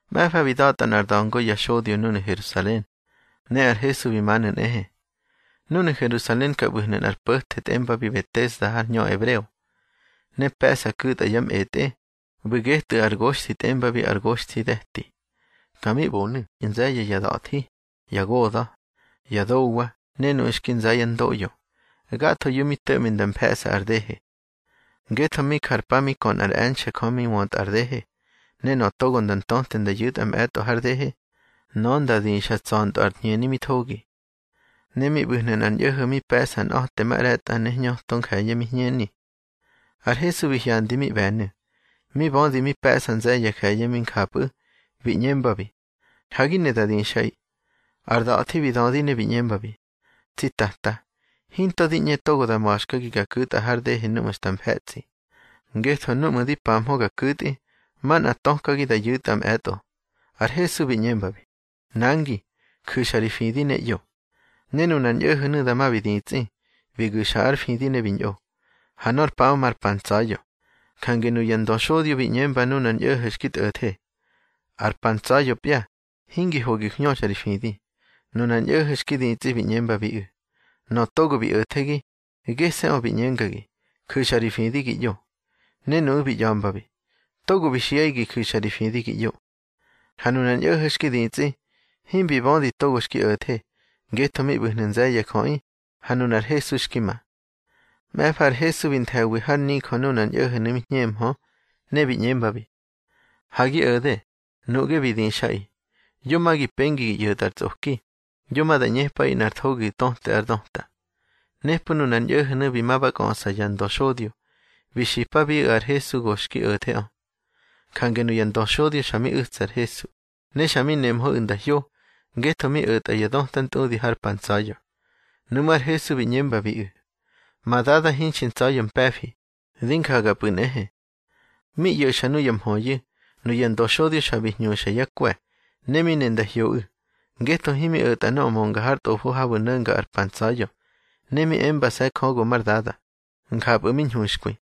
Mꞌe̱fa bi da̱tꞌa nꞌár da̱ngo ya xodyo núnu̱ Herusalen, ne ar Hesu bi manu̱ nꞌehe. Núnu̱ Herusalen ka ꞌbu̱hnu̱ nꞌar po̱the tꞌembabi Betesda har hñö ebreo, ne pe̱ꞌsa ku̱tꞌa ya mꞌetꞌe, ꞌbu̱ getꞌu̱ ar goxthi tꞌembabi ar Goxthide̱ti. Ka mi ꞌbonu̱ nze̱ye̱ ya da̱thi, ya goda̱, ya dowa ne nuꞌu̱ xki nza yá ndoꞌyo, gathoyu̱ mi to̱ꞌmi nda mfe̱ꞌsa ar dehe. Ngetho mi jar pa mi kö nꞌár e̱nxe̱ Jö mi wöntꞌa ar dehe, ne nöꞌö togo nda ntöte nda yu̱tꞌa mꞌe̱tꞌo har dehe, nöꞌö nda dixa tsa̱ntꞌö ar hñeni mi thogi. Ne mi ꞌbu̱hnu̱ nꞌar ñꞌo̱ho̱ mi pe̱ꞌsa nꞌa̱temaꞌre̱tꞌa ne hñöto nje̱ye̱ mi hñeni. Ar Hesu bi hyandi mi ꞌbe̱nu̱, mi bödi mi pe̱ꞌsa nze̱ye̱ ya je̱ye̱ mi njapꞌu̱, bi ꞌñembabi: —Ha gi ne da dixꞌaꞌi. Ar da̱thi bi dödi ne bi ꞌñembabi: —Tsi Tata, hinto di ꞌñe togo da ma̱xkagi ga ku̱tꞌa har dehe núꞌmu̱ xta mfe̱tsꞌi, ngetho núꞌmu̱ di pahmö ga ku̱tꞌi, manꞌa tökagi da yu̱tꞌa mꞌe̱tꞌo. Ar Hesu bi ꞌñembabi: —Nangi, ju̱xa ri fidi ne ꞌyo. Ne nunar ñꞌo̱ho̱nu̱ dama bi ditsꞌi, bi gu̱xa ár fidi ne bi ñꞌo. Ha nor paꞌö mar pa ntsa̱ya̱. Jange nuya ndöxodyo bi ꞌñembabi nunar ñꞌo̱ho̱ xki tꞌo̱the: —Ar pa ntsa̱ya̱pya, hingi ho gi hñöxa ri fidi. Nunar ñꞌo̱ho̱ xki ditsꞌi bi ꞌñembabiꞌu̱: —Nöꞌö togo bi o̱thegi, gese̱ꞌö bi ꞌñengagi: Ju̱xa ri fidi gi ꞌyo. Ne nuꞌu̱ bi ꞌya̱mbabi: —Togo bi xiꞌaꞌi gi ju̱xa ri fidi gi ꞌyo. Ha nunar ñꞌo̱ho̱ xki ditsꞌi, himbi bödi togo xki o̱the, ngetho mi ꞌbu̱hnu̱ nze̱ye̱ ya jöꞌi, ha nunar Hesu xki ma. Mꞌe̱fa ar Hesu bi nthe̱wi har nijö nunar ñꞌo̱ho̱nu̱ mi hñemhö, ne bi ꞌñembabi: —Ha gi o̱de, nuꞌge bi dixꞌaꞌi. Yo ma gi pengi gi ꞌyo̱tꞌa ar tsꞌoki, yo ma da ꞌñepꞌaꞌi nꞌar thogi di töte ár döta. Nepꞌu̱ nunar ñꞌo̱ho̱nu̱ bi ma ba kꞌöꞌsa ya ndöxodyo, bi xipabiꞌu̱ ar Hesu go xki o̱theꞌö. Jange nuya ndöxodyo xa mi u̱tsa ar Hesu, ne xa mi nemhöꞌu̱ nda hyo, ngetho mi o̱tꞌa ya döta ntꞌudi har pa ntsa̱ya̱. Nuꞌmú̱ ar Hesu bi ꞌñembabiꞌu̱: —Ma Dada hinxi ntsa̱ya̱ mpe̱fi, di njagapꞌu̱ nꞌehe. Mi ꞌyo̱xa nuya mhöyu̱, nuya ndöxodyo xa bi hñuxa yá kwe̱. Ne mi ne nda hyoꞌu̱, ngetho himi o̱tꞌa nöꞌö mönga har tꞌofo habu̱ no̱nga ar pa ntsa̱ya̱, ne mi embase̱ Jö go már Dada, njapꞌu̱ mi ñhuxkwi.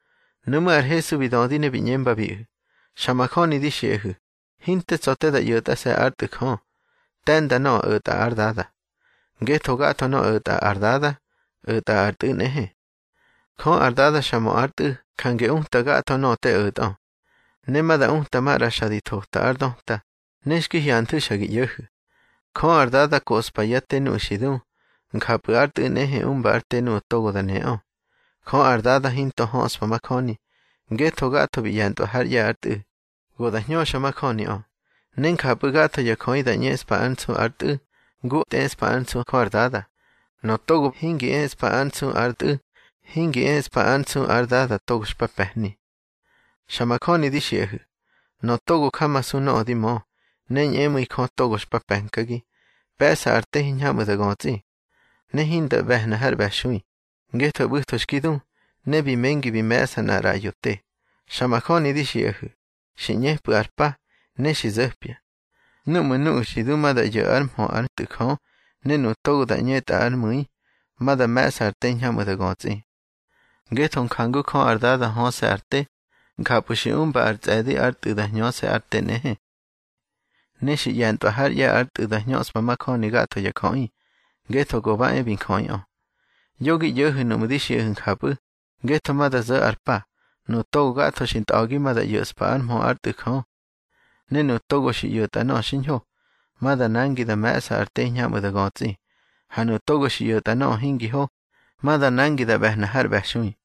Nuꞌmú̱ ar Hesu bi dödi ne bi ꞌñembabiꞌu̱: —Xa majöni di xiꞌahu̱, hinte tsa̱ te da ꞌyo̱tꞌase̱ ár Tꞌu̱ Jö. Te̱nda nöꞌö o̱tꞌa ár Dada, ngetho gatho nöꞌö o̱tꞌa ar Dada, o̱tꞌa ar Tꞌu̱ nꞌehe. Jö ar Dada xa mö ár Tꞌu̱ jange uta gatho nöꞌö te o̱tꞌö. Ne ma da uta maꞌra xa di thota ár döta, ne xki hyanthu̱ xa gi ꞌyo̱hu̱. Jö ar Dada koꞌspa yá te nuꞌu̱ xi du, njapꞌu̱ ár Tꞌu̱ nꞌehe umba ár te nuꞌu̱ togo da neꞌö. Jö ar Dada hinto höꞌspa majöni, ngetho gatho bi ꞌye̱ntꞌwa hár ꞌye̱ ár Tꞌu̱, go da hñöxa majöniꞌö. Ne njapꞌu̱ gatho ya jöꞌi da ꞌñeꞌspa ár nsu ar Tꞌu̱, ngu tꞌeꞌspa ár nsu Jö ar Dada. Nöꞌö togo hingi eꞌspa ár nsu ar Tꞌu̱, hingi eꞌspa ár nsu ar Dada togo xpa pe̱hni. Xa majöni di xiꞌahu̱, nöꞌö togo jamasu nöꞌö di mö, ne ñꞌemu̱i Jö togo xpa pe̱nkagi, pe̱ꞌsa ar te hiñhamꞌu̱ da götsꞌi. Ne hinda ꞌbe̱hna har ꞌbe̱xui, ngetho ꞌbu̱tho xki du, ne bi mengi bi me̱ꞌsa nꞌar ꞌraꞌyo te. Xa majöni di xiꞌahu̱, xi ꞌñepꞌu̱ ar pa, ne xi zo̱pya, núꞌmu̱ nuꞌu̱ xi du ma da ꞌyo̱ ár mhö ár Tꞌu̱ Jö, ne nuꞌu̱ togo da ꞌñetꞌa ár mu̱i, ma da me̱ꞌsa ar te hiñhamꞌu̱ da götsꞌi. Ngetho jangu Jö ar Dada höse̱ ar te, njapꞌu̱ xi umba ar tsꞌe̱di ár Tꞌu̱ da hñöse̱ ar te nꞌehe. Ne xi ꞌye̱ntꞌwa hár ꞌye̱ ár Tꞌu̱ da hñöꞌspa majöni gatho ya jöꞌi, ngetho go ba e bi njöꞌiꞌö. Yo gi ꞌyo̱hu̱ nuꞌmu̱ di xiꞌahu̱ njapꞌu̱, ngetho ma da zo̱ ar pa, nuꞌu̱ to gatho xi tꞌa̱gi ma da ꞌyo̱ꞌspa ár mhö ár Tꞌu̱ Jö. Ne nuꞌu̱ togo xi ꞌyo̱tꞌa nöꞌö xiñho, ma da nangi da me̱ꞌsa ar te hiñhamꞌu̱ da götsꞌi. Ha nuꞌu̱ togo xi ꞌyo̱tꞌa nöꞌö hingi ho, ma da nangi da ꞌbe̱hna har ꞌbe̱xui.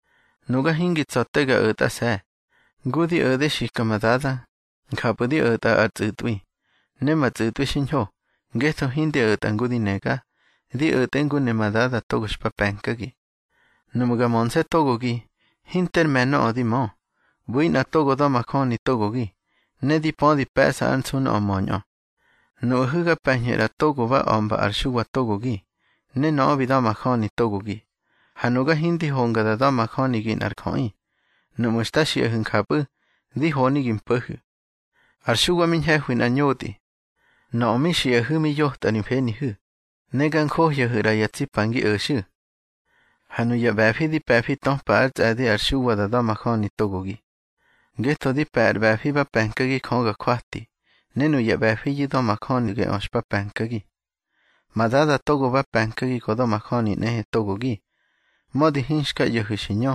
Nuga hingi tsa̱ te ga o̱tꞌase̱. Ngu di o̱de xika ma Dada, njapꞌu̱ di o̱tꞌa ar tsꞌu̱tꞌwi. Ne ma tsꞌu̱tꞌwi xiñho, ngetho hindi o̱tꞌa ngu di nega, di o̱tꞌe ngu ne ma Dada togo xpa pe̱nkagi. Nuꞌmu̱ ga mönse̱ togogi, hinter me̱ nöꞌö di mö. ꞌBu̱i nꞌa togo da̱majöni togogi, ne di pödi pe̱ꞌsa ár nsu nöꞌö möñꞌö. Nuꞌahu̱ ga pe̱ñhu̱ ꞌra togo ma ba a̱mba ar Xuwa togogi, ne nöꞌö bi da̱majöni togogi. Ha nuga hindi honga da da̱majönigi nꞌar jöꞌi. Nuꞌmu̱ xta xiꞌahu̱ njapꞌu̱, di honi gi mpo̱hu̱. Ar Xuwa mi ñhe̱hwi nꞌar ñotꞌi. Nöꞌö mi xiꞌahu̱ mi yotꞌa ri mfenihu̱, ne ga njohyahu̱ ꞌra ya tsi pa ngi o̱xu̱. Ha nuya ꞌbe̱fi di pe̱fi töpa ár tsꞌe̱di ar Xuwa da da̱majöni togogi. Ngetho di pe̱ ar ꞌbe̱fi ba pe̱nkagi Jö ga jwati, ne nuya ꞌbe̱fiyu̱ da̱majöni geꞌö xpa pe̱nkagi. Ma Dada togo ba pe̱nkagi go da̱majöni nꞌehe togogi, mödi hinxka ꞌyo̱hu̱ xi ñö,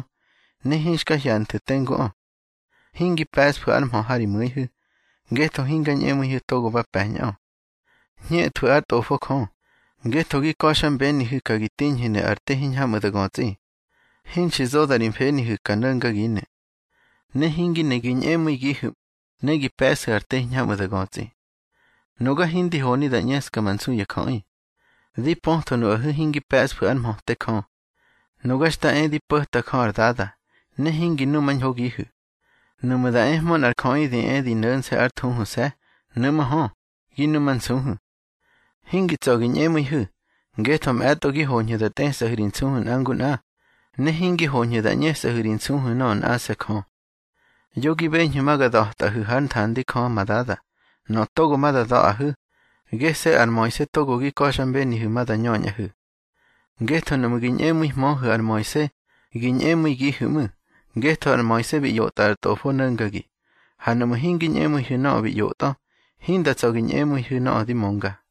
ne hinxka hyanthu̱ tenguꞌö. Hingi pe̱ꞌsfu̱ ár mhö ha ri mu̱ihu̱, ngetho hinga ñꞌemu̱ihu̱ togo ba pe̱ñꞌö. Hñethwu̱ ár Tꞌofo Jö, ngetho gi ka̱xmbenihu̱ ka gi tiñhu̱nu̱ ar te hiñhamꞌu̱ da götsꞌi. Hinxi zoda ri mfenihu̱ ka no̱ngaginu̱. Ne hingi ne gi ñꞌemu̱igihu̱, ne gi pe̱ꞌsu̱ ar te hiñhamꞌu̱ da götsꞌi. Nuga hindi honi da ꞌñeska ma nsu ya jöꞌi. Di pötho nuꞌahu̱ hingi pe̱ꞌsfu̱ ár mhöte Jö. Nuga xta e di po̱ta Jö ar Dada, ne hingi numañhogihu̱. Nuꞌmu̱ da ehmö nꞌar jöꞌi di e di no̱nse̱ ár thuhuse̱, nuꞌmú̱ hö, gi numansuhu̱. Hingi tsa̱ gi ñꞌemu̱ihu̱, ngetho mꞌe̱tꞌo gi hoñhu̱ da tꞌesꞌahu̱ ri nsuhu̱ nꞌa ngu nꞌa, ne hingi hoñhu̱ da ꞌñesꞌahu̱ ri nsuhu̱ nöꞌö nꞌase̱ Jö. Yo gi beñhu̱ ma ga da̱tꞌaꞌihu̱ hár nthandi Jö ma Dada. Nöꞌö togo ma da da̱ꞌahu̱, gese̱ ar Moise togo gi ka̱xmbenihu̱ ma da ñöñꞌahu̱. Ngetho nuꞌmu̱ gi ñꞌemu̱ihmöhu̱ ar Moise, gi ñꞌemu̱igihu̱ ꞌmu̱, ngetho ar Moise bi ꞌyotꞌa ar tꞌofo no̱ngagi. Ha nuꞌmu̱ hingi ñꞌemu̱ihu̱ nöꞌö bi ꞌyotꞌö, hinda tsa̱ gi ñꞌemu̱ihu̱ nöꞌö di mönga.